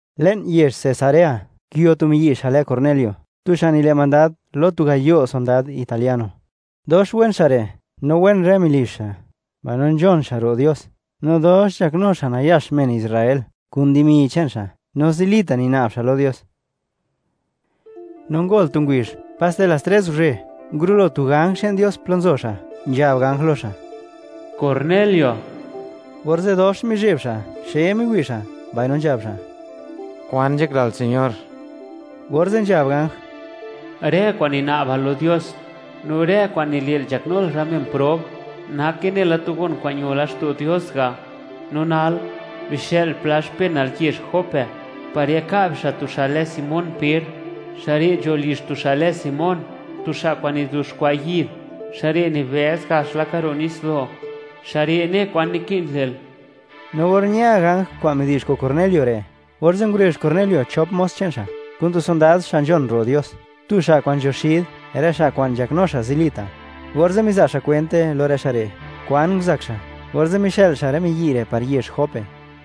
Le'n yezh Cesarea, nguio tu miyi' xa' lë Cornelio, tu xa' nile' mandad lo tu gayo' sondad italiano. Dox wen xa' re', no wen rë melizh xa', mbaino nzhon xa' ro' Dios, no dox nzhaknu xa' nayax men Israel kun dimi che'n xa', no zilita' nina'b xa' lo Dios. No ngol tu ngubizh, paste las tres guzhe, ngurulo tu ganj che'n Dios plo nzo xa', nzhab ganj lo xa': ―¡Cornelio! Orze' dox mizheb xa', xe miwi' xa', mbaino nzhab xa': ―¿Kwan nzhaklal, Señor? Orze' nzhab ganj: ―Rë kwa'n nina'bal lo Dios, no rë kwa'n nile'l nzhaknul rë men prob, nake nela tu gon kwa'n ño laxto' Dios ga'. No nal, bixë'l pla xpenal yezh Jope, par yaka' bixa' tu xa' lë Simón Per. Xa' re' nzho lizh tu xa' lë Simón, tu xa' kwa'n nizuxkwa' yid, xa' re' nibëz gax laka ro' nitsdo'. Xa' re' ne kwan naki'n le'l. No or ña ganj kwa'n midi'zh kun Cornelio re', orze' ngurezh Cornelio chop mos che'n xa', kun tu sondad xa' nzhon ro' Dios, tu xa' kwa'n nzho xid rë xa' kwa'n nzhaknu xa' zilita'. Orze' miza' xa' kwente lo rë xa' re', kwan nguzak xa', orze' mixë'l xa' rë miyi' re' par yezh Jope.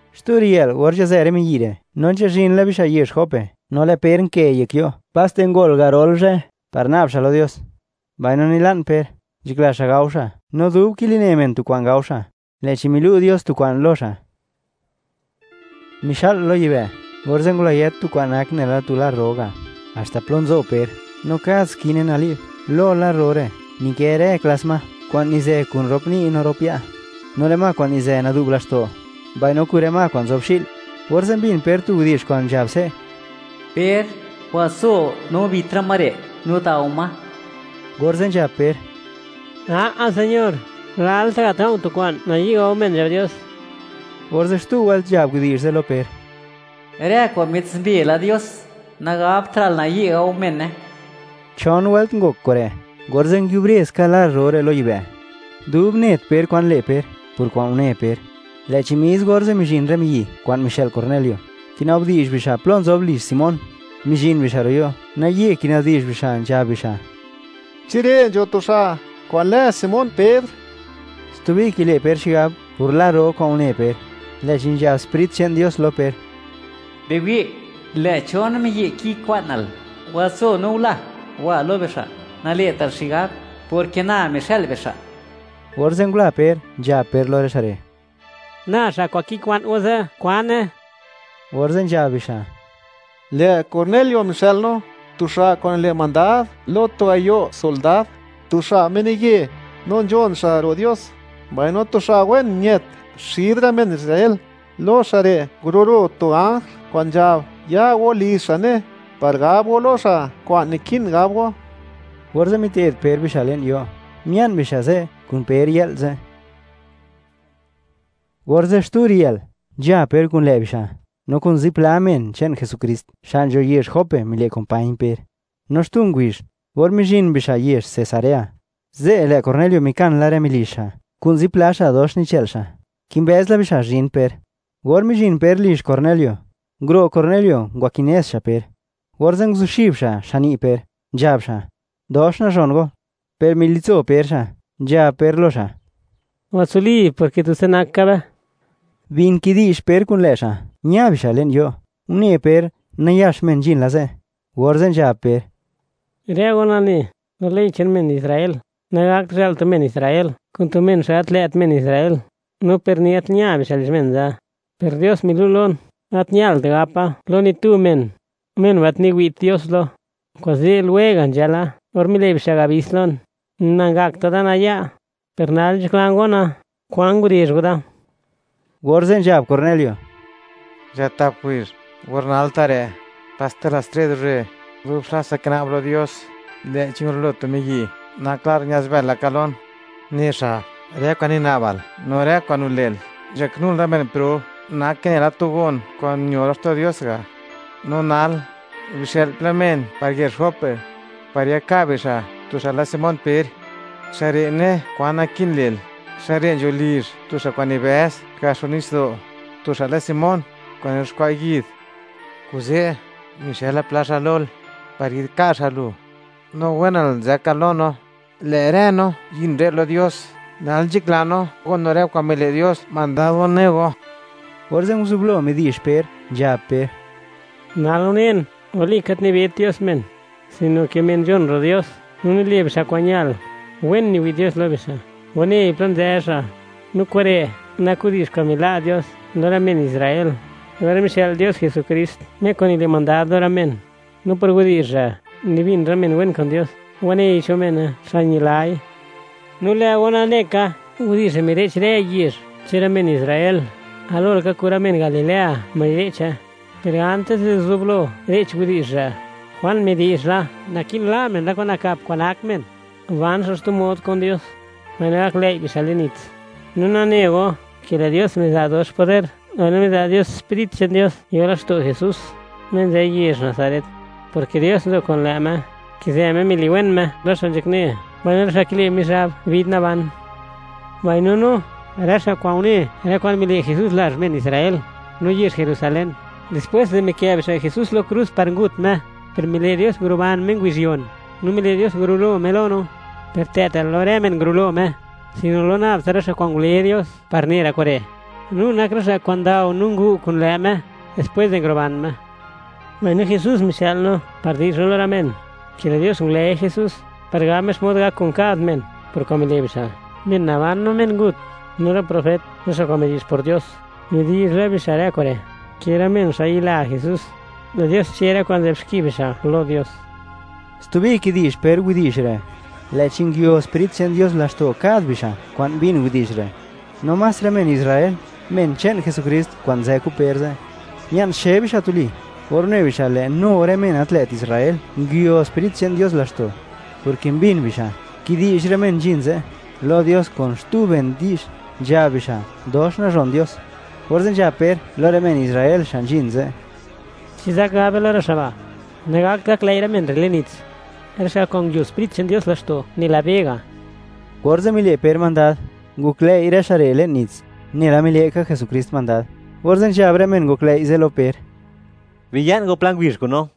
Xtu riyë'l, or nzhazë rë miyi' re', no nzhazhin la bixa' yezh Jope, no lë' Per nkë yek yo', paste ngol garol zhë, par na'b xa' lo Dios. Mbaino nila'n Per, nzhakla xa' gao xa', no dub kiline men tu kwa'n gao xa', lë'chi milu' Dios tu kwa'n lo xa'. Mixa'l lo yibë', orze' ngulayët tu kwa'n nak nela tu lar ro ga' haxta plo nzo Per, no kad skine nali'b. Lo lar ro re' nikë rë klas ma kwa'n nizë kun rop ni' no rop ya', no rë ma kwa'n nizë nadu'b laxto', mbaino kun rë ma kwa'n nzob xi'l. Orze' mbin Per tu widi'zh kwa'n nzhab se': ―Per, watso no bit rë ma re' no dao ma. Orze' nzhab Per: ―¡A'a Señor!, lalta' gat ga̱u̱ tu kwa'n nayi' gao men nzhab Dios. Orze' xtu wëlt nzhab widi'zh ze' lo Per: ―Rë kwa'n mitsumbe la Dios, nagabtra'l nayi' gao mene. Chon wëlt ngok kure', orze' nguiubre ska lar ro re' lo yibë'. Dub net Per kwan le' Per por kwa'n une Per, lë'chi mis orze' mizhin rë miyi' kwa'n mixë'l Cornelio, kinabdi'zh bixa' plo nzob lizh Simón, mizhin bixa' ro' yo'. Naye kinabdi'zh bixa', nzhab bixa': “¿Chi re' nzho tu xa' kwa'n lë Simón Per?” Stubi kile' Per xigab por lar ro kwa'n une Per, lë'chi nzhab Sprit che'n Dios lo Per: ―Biwi', lë' chon miyi' kikwa'nal. Watso no gula, wa lo bixa'. Nale'tal xigab, porke na mixë'l bixa'. Orze' ngula Per, nzhab Per lo rë xa' re': ―Na xa' kwa'n kikwa'n go ze'. ¿Kwan ne go? Orze' nzhab bixa': ―Lë' Cornelio mixë'l no, tu xa' kwa'n nile' mandad lo tu gayo' sondad, tu xa' menaye, no nzhon xa' ro' Dios, mbaino tu xa' wen ñët xid rë men Israel. Lo xa' re' ngurulo tu ganj kwa'n nzhab ya go lizh xa' ne, par gab go lo xa' kwa'n naki'n gab go. Orze' mite'd Per bixa' le'n yo', mia'n bixa' ze' kun Per yë'l ze'. Orze' xtu riyë'l, nzha Per kun lë' bixa', no kun zipla men che'n Jesukrist xa' nzho yezh Jope mile' kumpañ Per. No xtu ngubizh, or mizhin bixa' yezh Cesarea, ze' lë' Cornelio mikan la rë melizh xa' kun zipla xa' dox nichë'l xa', kimbëz la bixa' zhin Per. Or mizhin Per lizh Cornelio, nguro' Cornelio ngwakinez xa' Per, orze' nguzuxib xa' xani' Per, nzhab xa': “Dox nazhon go.” Per militso Per xa', nzhab Per lo xa': ―Watsuli, porke tutsa nak ka be. Bin kidi'zh Per kun lë' xa', ña bixa' le'n yo', une Per, nayax men nzhin la ze', orze' nzhab Per: ―Rë go nane, lo ley che'n men Israel, nagakt zhë'l tu men Israel kun tu men xa' gat lë't men Israel, no per ni gat ña bixa' lizh men ze'. Per Dios milu' lon, gat ñalt gapa lo ni tu men: “Men ba', gat niwi't Dios lo.” Kuze' lwega' nzhala or mile' bixa' abis lon, nangakta' da naya'. Per nal nzhaklan gona, ¿kwan ngurezh go da? Orze' nzhab Cornelio: ―Nzha tap ngubizh, or nal ta' re', paste las tres guzhe, duba xlatsa kina'ba lo Dios, lë'chi ngurulo tu miyi' nak lar ña'zbël laka lon, ne xa': “Rë kwa'n nina'bal, no rë kwa'n nile'l nzhaknul rë men prob, nake nela tu gon kwa'n ño laxto' Dios ga'. No nal, bixë'l pla men par yezh Jope, par yaka' bixa' tu xa' lë Simón Per. Xa' re' ne kwan naki'n le'l, xa' re' nzho lizh tu xa' kwa'n nibëz gax ro' nitsdo', tu xa' lë Simón, kwa'n nizuxkwa' yid.” Kuze' mixëla pla xa' lo go, par yi'dka' xa' go, no wen go nzëka go lo no. Lë' rë no nzhin re' lo Dios, nal nzhakla no gon no rë kwa'n mile' Dios mandad go, ne go. Orze' nguzublo midi'zh Per, nzhab Per: ―Nal unen, walika, gat nibet Dios men, sino ke men nzhon ro' Dios no nile' bixa' kwa'n ñal, wen niwi' Dios lo bixa', wanei plo nzë xa'. No kure' nak widi'zh kwa'n mila' Dios lo rë men Israel, or mixë'l Dios Jesukrist, Me kwa'n nile' mandad lo rë men. No por widi'zh re', nibin rë men wen kun Dios, wanei cho mene, xa' ñilai. No lë' go nane ka widi'zh re' mire'ch rë yezh che'n rë men Israel, galo laka kun rë men Galilea mire'che. Per antis di zublo re'ch widi'zh re', Juan midi'zh la, naki'n la' men rë kwa'n nakap kwa'n nak men, ban xa' xtu mod kun Dios, mbaino gaklëi' bixa' le'n nits. No nane go, ke lë' Dios miza' dox poder, mbaino miza' Dios Sprit che'n Dios yo laxto' Jesús, Me nzë yezh Nazaret; porke Dios nzo kun lë' Me, nkizë Me miliwen Me rë xa' nzhakne mbaino rë xa' kile' Mizhab bid naban. Mbaino no, rë xa' kwa'n une, rë kwa'n mile' Jesús, lazh men Israel, no yezh Jerusalén, dispwés di mikë' bixa' Jesús lo krus par ngut Me. Per mile' Dios nguruban Me ngubizh yon, no mile' Dios ngurulo Me lo no. Per gat lë'ta' lo rë men ngurulo Me, sino lo nab tsa rë xa' kwa'n ngule Dios par ne rë kure'. No nak rë xa' kwa'n ndao no ngu' kun lë' Me dispwés di nguruban Me. Mbaino Jesús mixë'l no par di'zh no lo rë men, ke lë' Dios ngule Jesús, par gab Me xmod gak kun kad men por kwa'n mile' bixa', men naban no men ngut. No rë profet, rë xa' kwa'n midi'zh por Dios, midi'zh la bixa' rë kure', ke rë men xa' yila Jesús, lë Dios che' rë kwa'n nzë'b xki bixa' lo Dios. Stubi kidi'zh Per widi'zh re', lë'chi nguio Sprit che'n Dios laxto' kad bixa' kwa'n mbin widi'zh re'. No más rë men Israel, men che'n Jesukrist kwa'n nzë kun Per ze', mia'n xe bixa' tuli, or une bixa', lë' nu rë xa' gat lë't men Israel, nguio Sprit che'n Dios laxto', porke mbin bixa', kidi'zh rë men nzhin ze' lo Dios kun xtu ben di'zh, nzhab bixa', dox nazhon Dios. Orze' nzhab Per lo rë men Israel xa' nzhin ze': ―¿Chi zak gab be lo rë xa' ba', nagakt gaklëi' rë men re' le'n nits, rë xa' kwa'n nguio Sprit che'n Dios laxto', nela be ga'? Orze' mile' Per mandad, ngoklëi' rë xa' re' le'n nits, nela mile' ka Jesukrist mandad. Orze' nzhab rë men ngoklëi' ze' lo Per: “Biya'n go pla ngubizh kun no.”